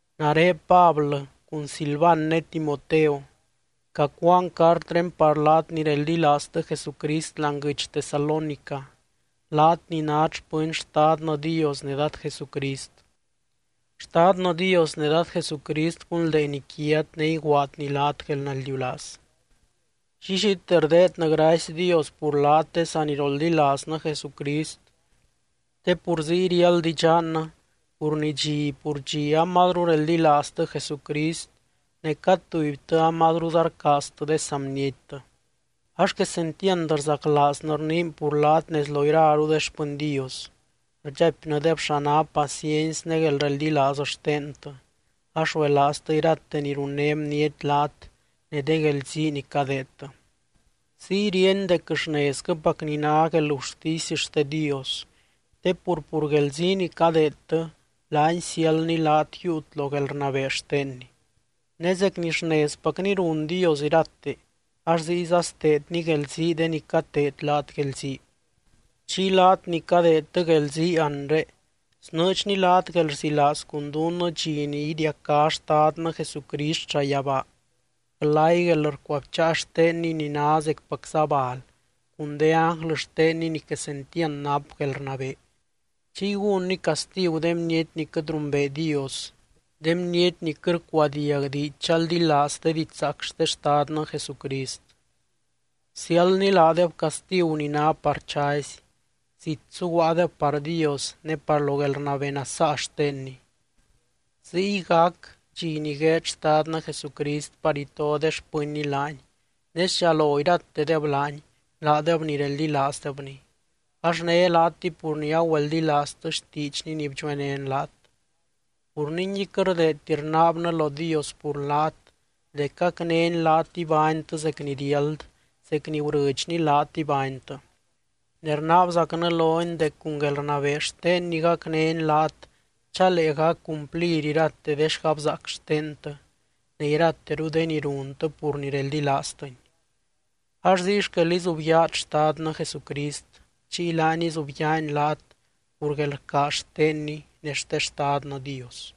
Nare Pablɨ, cun Silvan ne Timoteo, cacuaan cartré par laat ni reldilaaztɨ Jesucrist láani guɨdx Tesalónica, laat ni nát xpɨny Xtadnɨ Dios ne Dad Jesucrist. Xtadnɨ Dios ne Dad Jesucrist gunldeeny quiat ne iguaadny laat guelnaldiulaaz. Llillite rdeednɨ gracy Dios pur laat de saniroldilaaznɨ Jesucrist, te pur ziy riáld idxannɨ pur ni dxi pur dxi amazru reldilaaztɨ Jesucrist, ne cad tubytɨ amazruza rcaaztɨ de saa bniettɨ. Ax quesentiand rzaclaaznɨ rniin pur laat nez lo iraru de xpɨny Dios. Rdxaipnɨdeb xa ná paciency ne guelreldilaaz xtentɨ, ax ruelaaztɨ irate ni runné bniety laat ne de guelzii ni cadeedtɨ. Ziy ríeny dec xnezquɨpacni ná guelgurtisy xte Dios te pur, pur guelzii ni cadeedtɨ, laany siáldny laat yiiut lo guelrnabee xtenny. Ne zec ni xnezpacni run Dios irate, ax ziyza steedny guelzii de ni cateed laat guelzii. Chiy laat ni cadeedtɨ guelzii anre, snɨɨdxny laat guelrzilaaz cun dunnɨ dxi ni idiacá Xtadnɨ Jesucrist llayabaa glay guelrcuabcháa xtenny ni ná zecpacza bal, cun de ánglɨ xtenny ni quesentiand nap guelrnabee. Chiy gúnny castigu de bniety ni quɨt rumbee Dios, de bniety ni quɨt rcuadiag diidx chaldilaaz de didxzaac xte Xtadnɨ Jesucrist. Siáldny laadeb castigu ni ná par chazy, zit suguaadeb par Dios ne par lo guelrnabee nasaa xtenny. Ziy gac dxi ni gueed Xtadnɨ Jesucrist par ito de xpɨnny laany, ne sdxalo iratedeb laany, laadeb ni reldilaazdebny. Ax né laatɨy pur ni agüeldilaaztɨ xtiidxny ni bdxuenén laat. Pur ningui quɨt rdeedti rnaabnɨ lo Dios pur laat dec gacnény laat ibánytɨ zec ni riáld, zec ni gurɨdxny laat ibánytɨ. Ne rnaabzacnɨ lony dec cun guelrnabee xtenny gacnény laat chalee gac cumplir irate de xgabzaac xtentɨ, ne irateru de ni runtɨ pur ni reldilaaztɨny. Ax ziy xquel izubyaat Xtadnɨ Jesucrist, chiy laany izubyaany laat pur guelrcaaz xtenny ne xte Xtadnɨ Dios.